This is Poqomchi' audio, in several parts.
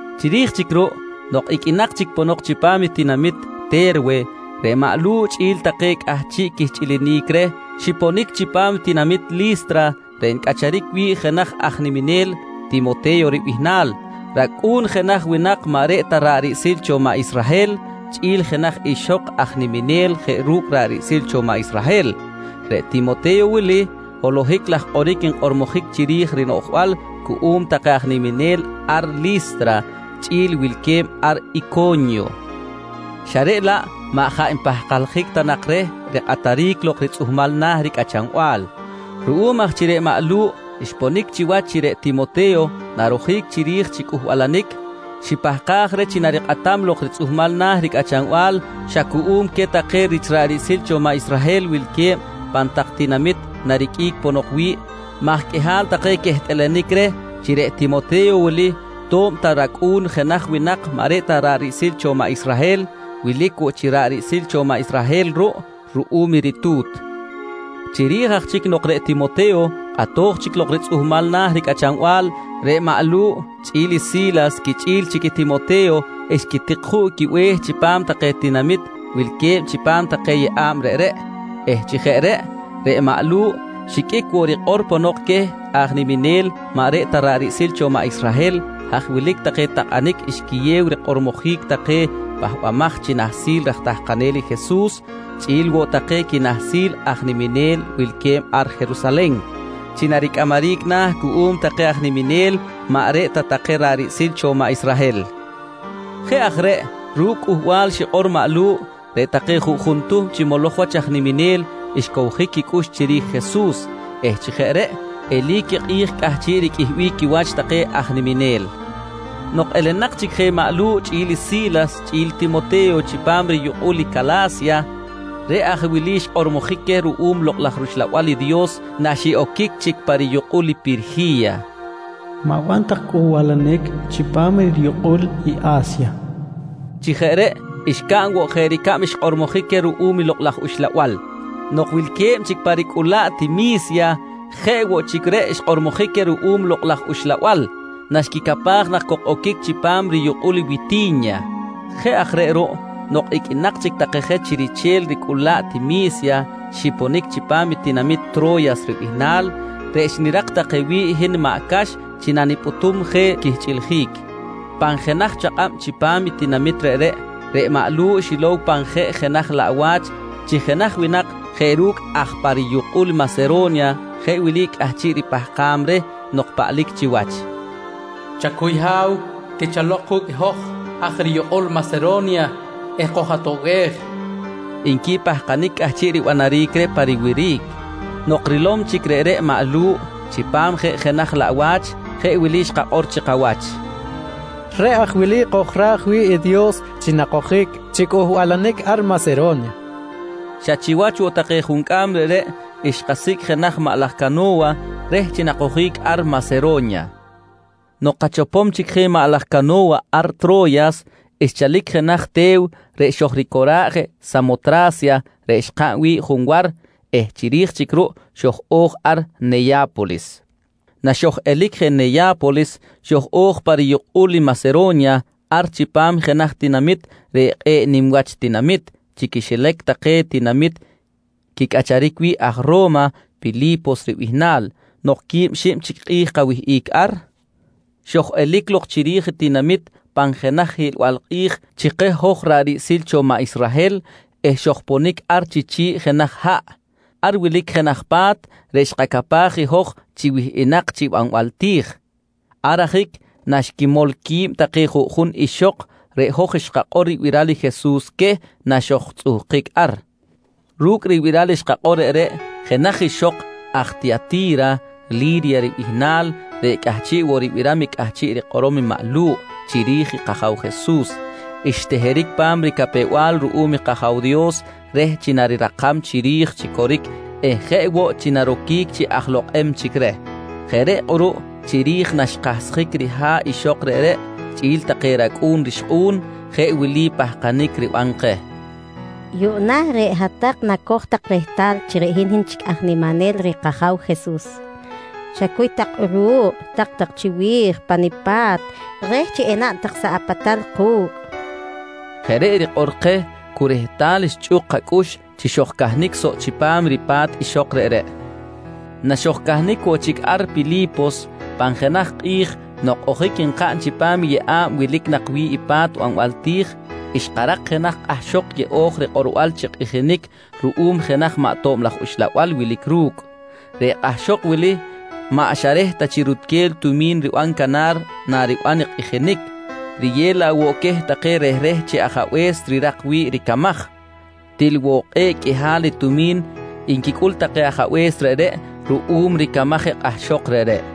Chiri̱j chic ruꞌ nok iqꞌuinak chic ponok chipam i tinamit Te̱rwe, reꞌ maꞌ Lu̱ꞌ chꞌi̱l take cꞌahchiꞌ quihchꞌilinic reh xiponic chipam i tinamit Li̱stra reꞌ ncꞌacharic wi̱ꞌ jenaj aj niminel Timote̱yo ribihnal, racꞌu̱n jenaj winak maꞌ reꞌ ta ra̱ꞌ riꞌsil cho maꞌ Israhel chꞌi̱l jenaj ixok aj niminel jeꞌ ru̱cꞌ ra̱ꞌ riꞌsil cho maꞌ Israhel. Reꞌ Timote̱yo wili, holohic laj kꞌoric nkꞌormojic chiri̱j rinoꞌjbal cuꞌum take aj niminel ar Li̱stra chꞌi̱l wilque̱b ar Ico̱nyo xa reꞌ laꞌ maꞌ jaꞌ npahkaljic ta nak reh rikꞌataric lok ritzꞌuhmal na̱ ricꞌachanbal. Ruꞌum aj chi reꞌ maꞌ Lu̱ꞌ xponic chiwach chi reꞌ Timote̱yo narojic chiri̱j chi cꞌuhbalanic, xipahkaj reh chi narikꞌatam lok ritzꞌuhmal na̱ ricꞌachanbal xa cuꞌum queh take rich ra̱ꞌ riꞌsil cho maꞌ Israhel wilque̱b pan tak tinamit nariqꞌuic ponok wi̱ꞌ maj qꞌuihal take quehtꞌalanic reh chi reꞌ Timote̱yo wili to̱b ta racꞌu̱n jenaj winak maꞌ reꞌ ta ra̱ꞌ riꞌsil cho maꞌ Israhel, wilic woꞌ chi ra̱ꞌ riꞌsil cho maꞌ Israhel ruꞌ ruꞌum i ritu̱t. Chiri̱j aj chic nok reꞌ Timote̱yo kꞌatoj chic lok ritzꞌuhmal na̱ ricꞌachanbal, reꞌ maꞌ Lu̱ꞌ chꞌi̱l i Si̱las quichꞌi̱l chic Timote̱yo xquitik juꞌ quibe̱h chipam take tinamit wilque̱b chipam take yeꞌa̱b reꞌreꞌ eh chi jeꞌ reꞌ, reꞌ maꞌ Lu̱ꞌ xiqꞌuic woꞌ rikꞌor ponok queh aj niminel maꞌ reꞌ ta ra̱ꞌ riꞌsil cho maꞌ Israhel, haj wilic take takꞌanic xquiyew rikꞌormojic take pahbamaj chi nahsil raj tahkanel i Jesus chꞌi̱l woꞌ take quinahsil aj niminel wilque̱b ar Jerusalen chi naricꞌamaric na̱ cuꞌum take aj niminel maꞌ reꞌ ta take ra̱ꞌ riꞌsil cho maꞌ Israhel. Jeꞌ aj reꞌ ru̱cꞌ i cꞌuhbal xikꞌor maꞌ Lu̱ꞌ, reꞌ take juꞌjun tuhm chi moloj wach aj niminel xcowjic quicꞌux chiri̱j i Jesus eh chi jeꞌ reꞌ eli̱c i kꞌi̱j cꞌahchiꞌ riqꞌuihbic quiwach take aj niminel. Nok elenak chic je maꞌ Lu̱ꞌ chꞌi̱l Si̱las chꞌi̱l Timote̱yo chipam riyukꞌul i Cala̱sya, reꞌ aj wili xkꞌormojic queh ruꞌum Lokꞌ laj rUxlabal i Dios naxiꞌoquic chic pa riyukꞌul i Pirji̱ya: «Ma̱ban tak cꞌuhbalanic chipam riyukꞌul i A̱sya, nqui xkꞌormojic queh. Chi jeꞌ reꞌ xcaꞌn woꞌ jeꞌ ricab xkꞌormojic queh ruꞌum i Lokꞌ laj Uxlabal. Nok wilque̱b chic pa ricꞌulaꞌt i Mi̱sya, jeꞌ woꞌ chic reꞌ xkꞌormojic queh ruꞌum i Lokꞌ laj Uxlabal naxquicapaj nak cok oquic chipam riyukꞌul i Witi̱nya. Jeꞌ aj reꞌ ruꞌ nok iqꞌuinak chic je take chi riche̱l ricꞌulaꞌt i Mi̱sya, xiponic chipam i tinamit Tro̱yas ribihnal reꞌ xnirak take wi̱ꞌ hin maꞌ Cax chi nanipꞌutum je quihchꞌiljic. Pan jenaj chakꞌab chipam i tinamit reꞌreꞌ, reꞌ maꞌ Lu̱ꞌ xilow pan jenaj jeꞌ laꞌwa̱ch chi jenaj winak jeꞌ ru̱cꞌ aj pa riyukꞌul Masero̱nya jeꞌ wili cꞌahchiꞌ ripahkam reh nok paꞌlic chiwach: «Chacuy ha̱w, tichalok ku̱cꞌ i hoj aj riyukꞌul Masero̱nya eh koj-atoꞌbej, nqui pahkanic cꞌahchiꞌ ribanaric reh pa riwiric. Nok rilom chic reꞌreꞌ maꞌ Lu̱ꞌ chipam jeꞌ jenaj laꞌwa̱ch, jeꞌ wili xkakꞌor chi kawach: «Reꞌ aj wili kojra̱j wi̱ꞌ i Dios chi nakojic chi cꞌuhbalanic ar Masero̱nya, nqui xkakꞌor chi kawach. Xa chiwach woꞌ ti juncꞌam reꞌreꞌ xkasicꞌ jenaj maꞌ laj cano̱wa reh chi nakojic ar Masero̱nya. Nok kachopom chic je maꞌ laj cano̱wa ar Tro̱yas, xchalic jenaj te̱w reꞌ xojricora̱ꞌ je ar Samotra̱sya reꞌ xkaꞌn wi̱ꞌ junwar eh chiri̱j chic ruꞌ xoj-o̱j ar Neya̱polis. Naxoj-elic je Neya̱polis, xoj-o̱j pa riyukꞌul i Masero̱nya ar chipam jenaj tinamit reꞌ kꞌe̱ꞌ nim wach tinamit chi quixilac take tinamit quicꞌacharic wi̱ꞌ aj Ro̱ma, Pili̱pos ribihnal. Nok quib xib chic kꞌi̱j kawihꞌic ar, xoj-elic lok chiri̱j i tinamit pan jenaj hiꞌlbal kꞌi̱j chi keh hoj ra̱ꞌ riꞌsil cho maꞌ Israhel eh xojponic ar chi chi̱ꞌ jenaj haꞌ. Ar wilic jenaj pa̱t reꞌ xkacapaj i hoj chi wihꞌinak chi banbal ti̱j. Ar ajic naxquimol qui̱b take juꞌjun ixok, reꞌ hoj xkakꞌor ribiral i Jesus queh naxojtzꞌuhkic ar. Ru̱cꞌ ribiral xkakꞌor reꞌreꞌ, jenaj ixok aj Tiyati̱ra Li̱rya ribihnal reꞌ cꞌahchiꞌ woꞌ ribiram i cꞌahchiꞌ rikꞌorom maꞌ Lu̱ꞌ chiri̱j i kAja̱w Jesus, xteheric pa̱m ricapew-bal ruꞌum kAja̱w Dios reh chi narirakam chiri̱j chi coric eh jeꞌ woꞌ chi naroquic chi aj lokꞌem chic reh. Jeꞌ reꞌ kꞌuruꞌ chiri̱j naxkahsjic riha̱ꞌ ixok reꞌreꞌ chꞌi̱l take racꞌu̱n rixkꞌu̱n, jeꞌ wili pahkanic riban keh: «Yuꞌna reꞌ hat-tak nacoj tak rehtal chi hin chic aj niminel reh kAja̱w Jesus. Chacuy tak kꞌuruꞌ, tak-tak chiwi̱j pa nipa̱t reh chi enaꞌn tak soꞌ apatal ku̱cꞌ, nqui xikꞌor keh. Jeꞌ reꞌ rikꞌor keh cu rehtal xchꞌuk kacꞌux chi xojcahnic soꞌ chipam ripa̱t ixok reꞌreꞌ. Naxojcahnic woꞌ chic ar Pili̱pos, pan jenaj kꞌi̱j nok ojic nkaꞌn chipam i yeꞌa̱b wilic nak wi̱ꞌ i pa̱t banbal ti̱j, xkarak jenaj kꞌahxok yeꞌo̱j rikꞌorbal chi kꞌijinic ruꞌum jenaj maꞌ tob laj uxlabal wilic ru̱cꞌ. Reꞌ kꞌahxok wili maꞌ xa reh ta chi rutquel i tumi̱n riban canar nariban i kꞌijinic, riyew laꞌ woꞌ queh take rehreh chi ajabe̱s rirak wi̱ꞌ ricamaj. Til woꞌ kꞌe̱ꞌ qꞌuihal i tumi̱n nquicꞌul take ajabe̱s reꞌreꞌ ruꞌum ricamaj i kꞌahxok reꞌreꞌ!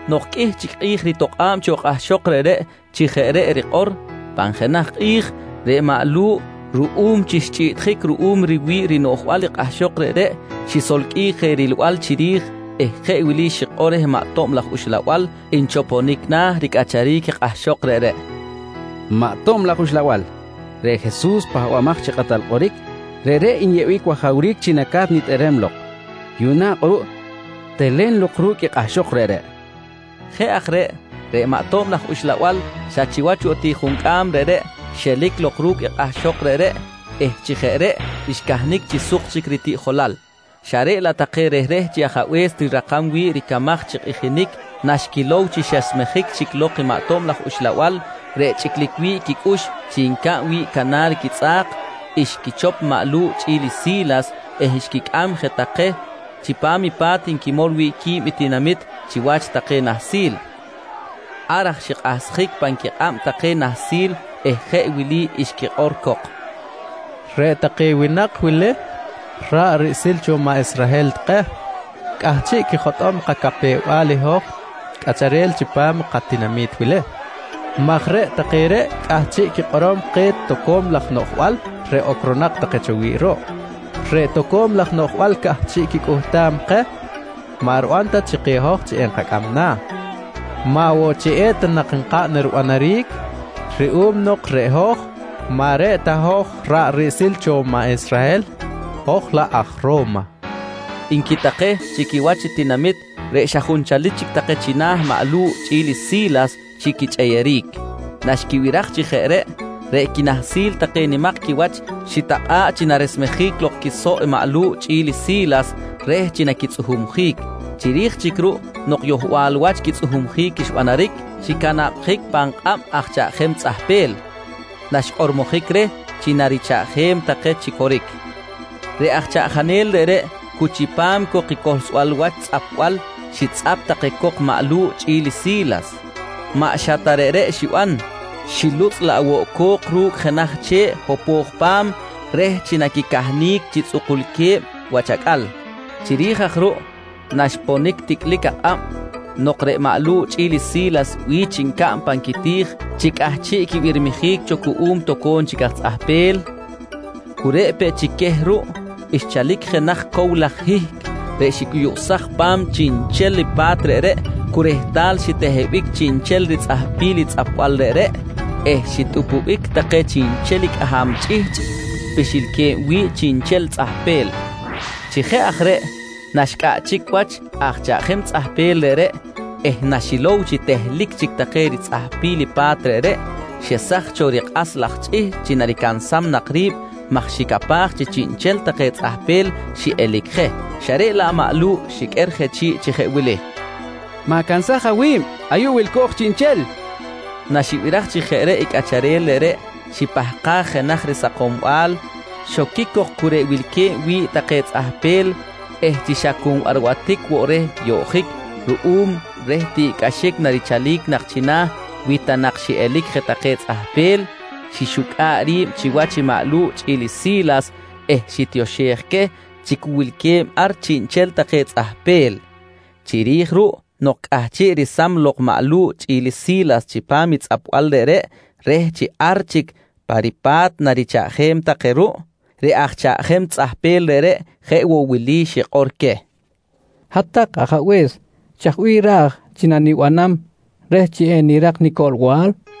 Nok qꞌuih chic kꞌi̱j ritokꞌa̱b cho kꞌahxok reꞌreꞌ chi jeꞌ reꞌ rikꞌor, pan jenaj kꞌi̱j reꞌ maꞌ Lu̱ꞌ ruꞌum chi xchꞌiꞌtjic ruꞌum riwi̱ꞌ rinoꞌjbal i kꞌahxok reꞌreꞌ, xisolqꞌuij je rilbal chiri̱j eh jeꞌ wili xikꞌor reh maꞌ tob laj uxlabal nchoponic na̱ ricꞌacharic i kꞌahxok reꞌreꞌ: «Maꞌ ato̱b laj uxlabal, reꞌ Jesus reꞌ Pahbamaj chi Kꞌatal Kꞌoric, reꞌreꞌ nyeꞌbic wajawric chi naca̱t nitꞌerem lok. Yuꞌna kꞌuruꞌ telen lok ru̱cꞌ i kꞌahxok reꞌreꞌ, nqui reh. Jeꞌ aj reꞌ, reꞌ maꞌ ato̱b laj uxlabal xa chiwach woꞌ ti juncꞌam reꞌreꞌ xelic lok ru̱cꞌ i kꞌahxok reꞌreꞌ eh chi jeꞌ reꞌ xcahnic chi suk chic ritiꞌjolal, xa reꞌ laꞌ take rehreh chi ajabe̱s rirakam wi̱ꞌ ricamaj chi kꞌijinic naxquilow chi xesmejic chic lok i maꞌ tob laj uxlabal reꞌ chꞌiclic wi̱ꞌ quicꞌux chi ncaꞌn wi̱ꞌ canar quitzꞌa̱k, xquichop i maꞌ Lu̱ꞌ chꞌi̱l Si̱las eh xquicꞌam jeꞌ take chipam i pa̱t nquimol wi̱ꞌ qui̱b i tinamit chiwach take nahsil. Ar xikꞌahsjic pan quikꞌab take nahsil eh jeꞌ wili xquikꞌor cok: «Reꞌ take winak wili ra̱ꞌ riꞌsil cho maꞌ Israhel take cꞌahchiꞌ quijotꞌom kacapew-bal i hoj cꞌacharel chipam i katinami̱t wili maj reꞌ take reꞌ cꞌahchiꞌ quikꞌorom keh toco̱m laj noꞌjbal reꞌ ocronak take cho wi̱ꞌ ruꞌ. Reꞌ toco̱m laj noꞌjbal cꞌahchiꞌ quicꞌuhtam keh maꞌ riban ta chi keh hoj chi enkacꞌam na̱, maꞌ woꞌ chi eta nak nkaꞌn ribanaric ruꞌum nok reꞌ hoj, maꞌ reꞌ ta hoj ra̱ꞌ riꞌsil cho maꞌ Israhel hoj laꞌ aj Ro̱ma, nqui take chi quiwach i tinamit reꞌ xa junchalic chic take china̱ maꞌ Lu̱ꞌ chꞌi̱l i Si̱las chi quichꞌeyeric. Naxquibiraj chi jeꞌ reꞌ, reꞌ quinahsil take nimak quiwach xitakꞌa̱ꞌ chi naresmejic lok quisoꞌ i maꞌ Lu̱ꞌ chꞌi̱l i Si̱las reh chi naquitzꞌuhumjic. Chiri̱j chic ruꞌ nok yohbal wach quitzꞌuhumjic xbanaric, xicanabjic pan kꞌab aj chaꞌjanel tzꞌahpel. Naxkꞌormojic reh chi narichaꞌjem take chi coric, reꞌ aj chaꞌjanel reꞌreꞌ cu chipam cok i cohlsbal wach tzꞌapbal xitzꞌap take cok i maꞌ Lu̱ꞌ chꞌi̱l i Si̱las. Maꞌ xa ta reꞌreꞌ xiban, xilutzꞌ laꞌ woꞌ i co̱k ru̱cꞌ jenaj che̱ꞌ hopo̱j pa̱m reh chi naquicahnic chi tzꞌukulque̱b wach acꞌal. Chiri̱j aj ruꞌ naxponic ticꞌlic akꞌab, nok reꞌ maꞌ Lu̱ꞌ chꞌi̱l i Si̱las bi̱ch ncaꞌn pan quiti̱j chi cꞌahchiꞌ quibirmijic cho cuꞌum toco̱m chic aj tzꞌahpel, cu reꞌ peꞌ chic queh ruꞌ, xchalic jenaj cow laj hihc reꞌ xicꞌuyuꞌsaj pa̱m chiꞌnchel i pa̱t reꞌreꞌ cu rehtal xitehebic chiꞌnchel ritzꞌahpil i tzꞌapbal reꞌreꞌ eh xitꞌupubic take cꞌaham chꞌihchꞌ pixilque̱b wi̱ꞌ chiꞌnchel tzꞌahpel. Chi jeꞌ aj reꞌ naxcꞌaꞌchic wach aj chaꞌjem tzꞌahpel reꞌreꞌ eh naxilow chi tehlic chic take ritzꞌahpil i pa̱t reꞌreꞌ, xesaj cho rikꞌas laj chꞌihchꞌ chi naricansam nak ri̱b maj xicapaj chi chiꞌnchel take tzꞌahpel xiꞌelic je, xa reꞌ laꞌ maꞌ Lu̱ꞌ xiqꞌuer je chi̱ꞌ chi jeꞌ wili: «Ma̱cansaj awi̱b, ayuꞌ wilco̱j chiꞌnchel, nqui je reh. Naxibiraj chi jeꞌ reꞌ i chaꞌjanel reꞌreꞌ, xipahkaj jenaj risakombal, xoquic cok cu reꞌ wilque̱b wi̱ꞌ take tzꞌahpel eh chi xa cu nbarbatic woꞌ reh yoꞌjic ruꞌum reh tiꞌcꞌaxic narichalic nak china̱ wi ta nak xiꞌelic je take tzꞌahpel, xixucꞌa̱ꞌ ri̱b chiwach maꞌ Lu̱ꞌ chꞌi̱l i Si̱las eh xitioxej queh chi cu wilque̱b ar chiꞌnchel take tzꞌahpel. Chiri̱j ruꞌ nok cꞌahchiꞌ resam lok maꞌ Lu̱ꞌ chꞌi̱l i Si̱las chipam i tzꞌapbal reꞌreꞌ reh chi ar chic pa ripa̱t narichaꞌjem take ruꞌ, reꞌ aj chaꞌjem tzꞌahpel reꞌreꞌ, jeꞌ woꞌ wili xikꞌor queh: «Hat-tak ajabe̱s, chaj bih raj chi nanibanam reh chi enirak nicoꞌlbal? nqui xikꞌor.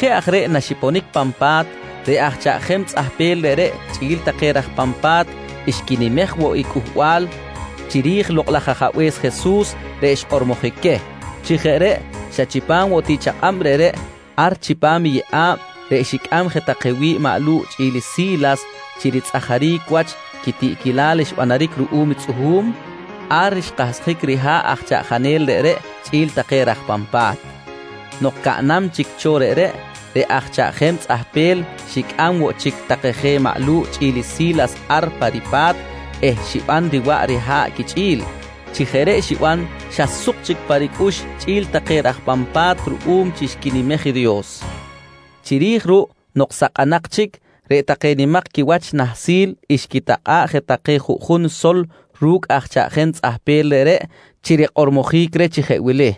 Jeꞌ aj reꞌ naxiponic pan pa̱t, reꞌ aj chaꞌjem tzꞌahpel reꞌreꞌ chꞌi̱l take raj pan pa̱t xquinimej woꞌ i Cꞌuhbal chiri̱j i Lokꞌ laj Ajabe̱s Jesus reꞌ xkꞌormojic queh. Chi jeꞌ reꞌ xa chipam woꞌ ti chakꞌab reꞌreꞌ, ar chipam i yeꞌa̱b reꞌ xicꞌam je take wi̱ꞌ maꞌ Lu̱ꞌ chꞌi̱l i Si̱las chi ritzꞌajaric wach quitiꞌquilal xbanaric ruꞌum i tzꞌuhu̱m, ar xkahsjic riha̱ꞌ aj chaꞌjanel reꞌreꞌ chꞌi̱l take raj pan pa̱t. Nok caꞌnam chic cho reꞌreꞌ, reꞌ aj chaꞌjem tzꞌahpel xicꞌam woꞌ chic take je maꞌ Lu̱ꞌ chꞌi̱l i Si̱las ar pa ripa̱t eh xiban riwaꞌ riha̱ꞌ quichꞌi̱l. Chi jeꞌ reꞌ xiban xa suk chic pa ricꞌux chꞌi̱l take raj pan pa̱t ruꞌum chi xquinimej i Dios. Chiri̱j ruꞌ nok sakꞌanak chic, reꞌ take nimak quiwach nahsil xquitakꞌa̱ꞌ je take juꞌjun sol ru̱cꞌ aj chaꞌjem tzꞌahpel reꞌreꞌ chi rikꞌormojic reh chi jeꞌ wili: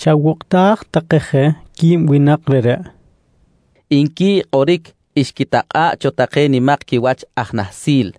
«Chawokꞌtaj take je qui̱b winak reꞌreꞌ, nqui kꞌoric xquitakꞌa̱ꞌ cho take nimak quiwach aj nahsil.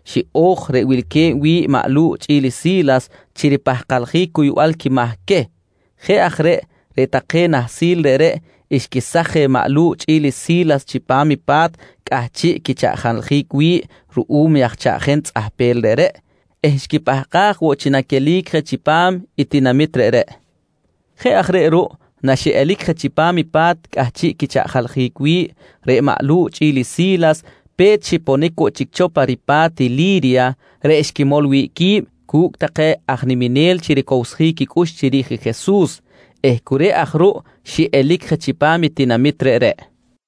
xiꞌo̱j reꞌ wilque̱b wi̱ꞌ maꞌ Lu̱ꞌ chꞌi̱l i Si̱las chi ripahkaljic cuybal quimahc queh. Jeꞌ aj reꞌ, reꞌ take nahsil reꞌreꞌ xquesaj je maꞌ Lu̱ꞌ chꞌi̱l i Si̱las chipam i pa̱t cꞌahchiꞌ quichaꞌjaljic wi̱ꞌ ruꞌum aj chaꞌjem tzꞌahpel reꞌreꞌ eh xquipahkaj woꞌ chi naquelic je chipam i tinamit reꞌreꞌ. Jeꞌ aj reꞌ ruꞌ naxiꞌelic je chipam i pa̱t cꞌahchiꞌ quichaꞌjaljic wi̱ꞌ, reꞌ maꞌ Lu̱ꞌ chꞌi̱l i Si̱las pe̱t xiponic woꞌ chic cho pa ripa̱t i Li̱rya reꞌ xquimol wi̱ꞌ qui̱b cu̱cꞌ take aj niminel chi ricowsjic quicꞌux chiri̱j Jesus eh cu reꞌ aj ruꞌ xiꞌelic je chipam i tinamit reꞌreꞌ.